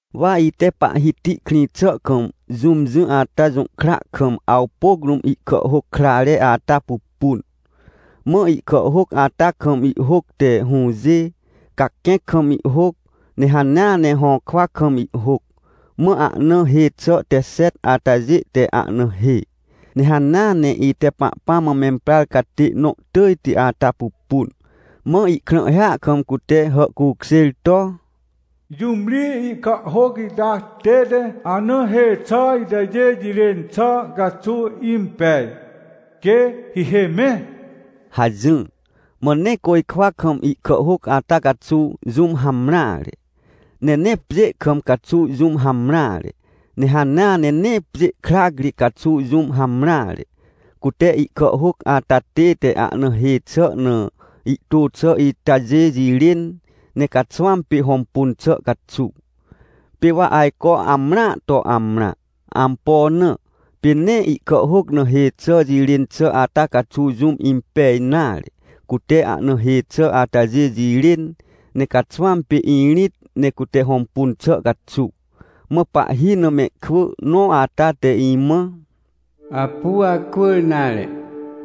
Wa ite Pahhiti krĩ xà kam jũm jỹ ata jũhkra kam, awpôc rũm, ihkàhhôc krãre ata pupun. Mã ihkàhhôc ata kam ihhôc te hũjê, caquẽc kam ihhôc, ne hanea ne hõkwa kam ihhôc. Mã ahna hê xà te xet atajê te ahna hê. Ne hanea ne ite Pahpãm mã memprar catê nõ tỳjti ata pupun, mã ihkrãhhia kam cute hàhcukjêr to: — Jũm ri ihkàhhôc ita tête ahna hê xà itajê jirên xà caxuw impej, quê hihê mẽ? — hajỹr. Mã nee côjkwa kam ihkàhhôc ata caxuw jũm hamreare, ne nee pjê kam caxuw jũm hamreare, ne hanea ne nee pjê krac ri caxuw jũm hamreare, cute ihkàhhôc ata tête ahna hê xà na ihtô xà itajê jirên, ne caxwãm pê hõmpun xà caxuw. Pê wa ajco amrãa to amrã. Ampo na? Pê nee ihkàhhôc na hê xà jirên xà ata caxuw jũm impej nare, cute ahna hê xà atajê jirên, ne caxwãm pê irĩt ne cute hõmpun xà caxuw. Mã pahhi na mehkwỳ nõ ata te imã: — Apu acwỳr nare,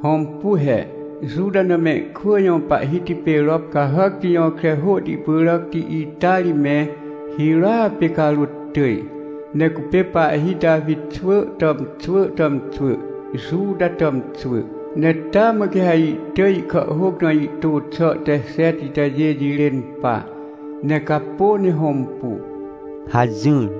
hõmpu he, Juta na mehkwỳ jõ Pahhiti pê rop cahàcti jõkre hôhti pyràcti ita ri me hirôa pê carôt tỳj. Ne cupê pahhi Tawi xwỳ tàmxwỳ tàmxwỳ, Juta tàmxwỳ, ne taa mã quê ha ihtỳj ihkàhhôc na ihtô xà te xet itajê jirên pa, ne capô ne hõmpu — hajỹr.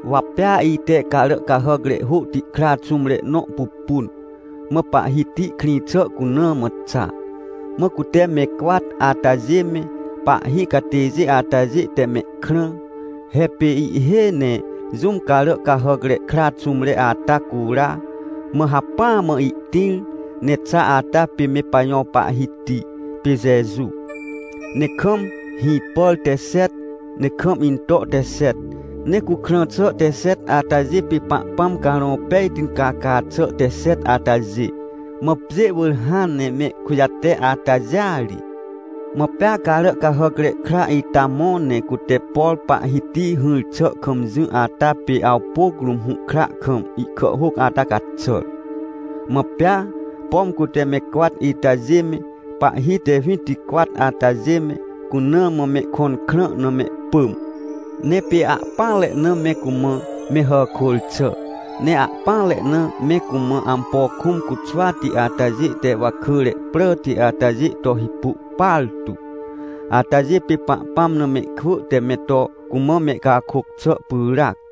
Wa pea ite carà cahàcre hôhti kra xũmre nõ pupun, mã Pahhiti krĩ xà cuna mã xa. Mã cute me cwat atajê me, pahhi catêjê atajê te mehkrã. He pê ihhêj ne jũm carà cahàcre kra xũmre ata cura, mã hacpỹa mã ihtĩr ne xa ata pê me pajõ Pahhiti pê Jeju. Ne kam hĩpàr te xet, ne kam into te xet. Ne cukrã xà te xet atajê pê Pahpãm Carõ Pejti caca xà te xet atajê, mã pjê wỳr hãn ne mehkujate, atajêa ri. Mã pea Caràcahàcre Kra ita mõ, ne cute, por Pahhiti hỹr xà kam jỹ ata pê awpôc rũm hũhkra kam ihkàhhôc ata caxàr. Mã pea, pom cute me cwat itajê me, pahhi te winticwat atajê me, cuna mã mehkõn krã na mehpỳm. Ne pê ahpỹanre na me cumã me hàkôr xà. Ne ahpỹanre na me cumã ampo kũm cuxwati atajê te wakỳre pràti atajê to hipu partu atajê pê Pahpãm na mehkwỳ te me to cumã mehcakôc xà pyràc.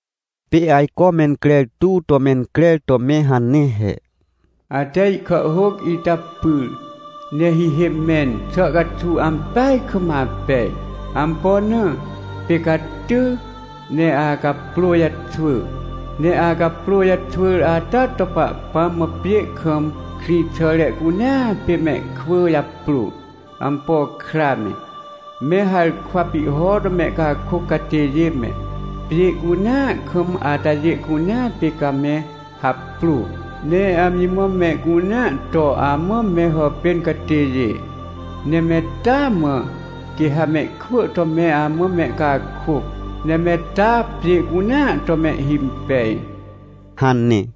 Pê ajco mencrer tuw to mencrer to me hane he: “Ate ihkàhhôc ita pyr ne hihê mẽn xà caxuw ampeaj kam apej! Ampo na? Pê ca ty, ne acaprô jaxwỳ. Ne acaprô jaxwỳr ata to Pahpãm mã pjê kam krĩxàre cunea pê mehkwỳ japrô, ampo kra me, me harkwa pihho to mehcakôc catêjê me, pjê cunea kam atajê cunea pê ca me haprô. Ne amji mã mehcunea to amã me hàpên catêjê. Ne me taa mã quê ha mehkwỳ to me amã mehcakôc, ne me taa pjê cunea to mehhimpej” hane.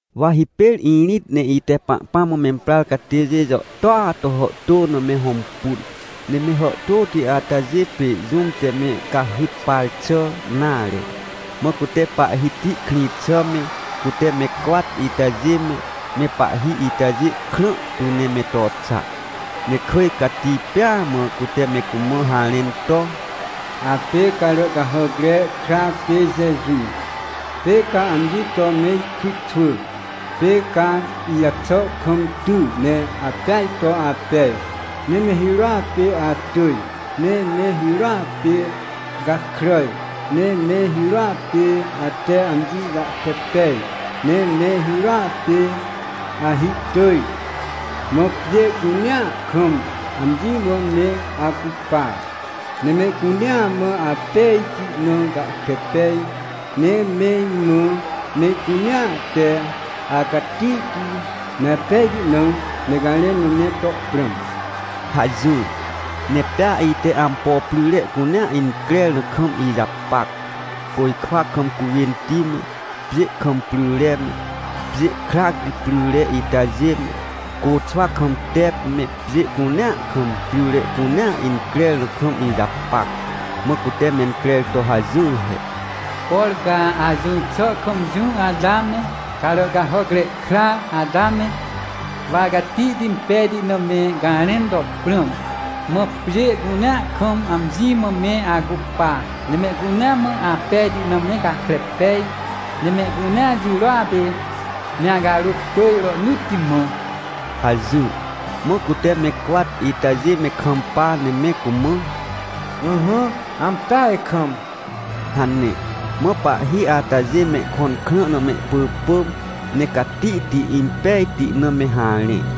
Wa hipêr irĩt ne ite Pahpãm mã memprar catêjê jàhtôa to hàhtô ne me hõmpun, ne me hàhtôti atajê pê jũm te me cahyt par xà nare. Mã cute Pahhiti krĩ xà me, cute me cwat itajê me, me pahhi itajê krã tu ne me to xa, ne kỳj cati pêa mã cute me cumã harẽn to: “Apê Caràcahàcre Kra pê Jeju. Pê ca amji to me ikritxwỳ, pê ca ijaxà kam ty ne apeaj to apej. Ne me hirôa pê atỳj, ne me hirôa pê gakràj, ne me hirôa pê ate amji jahkre pej, ne me hirôa pê ahihtỳj! Mã pjê cunea kam amji mã me acupa, ne mehcunea mã apejti na gahkre pej, ne me imã mehcunea te acatihti me apejti na me garẽn na me to prãm!” hajỹr. Ne pea ite ampo pryre cunea increr na kam ijapac. Côjkwa kam cuwênti me, pjê kam pryre me, pjê krac ri pryre itajê me, côxwa kam tep me, pjê cunea kam, pryre cunea increr na kam ijapac. Mã cute mencrer to hajỹr he: “Por ca ajỹr xà kam jỹ ata me, Caràcahàcre Kra ata me, wa acatihti impejti na me garẽn to prãm. Mã pjê cunea kam amji mã me acupa, ne mehcunea mã apejti na me gahkre pej, ne mehcunea jirôa pê me acarôt tỳj rohnỳtti mã” hajỹr. Mã cute me cwat itajê me kampa ne me cumã: — Ỹhỹ, ampeaj kam! — hane. Mã pahhi atajê mehkõn krã na mehpỳpỳm, ne catihti impejti na me harẽ.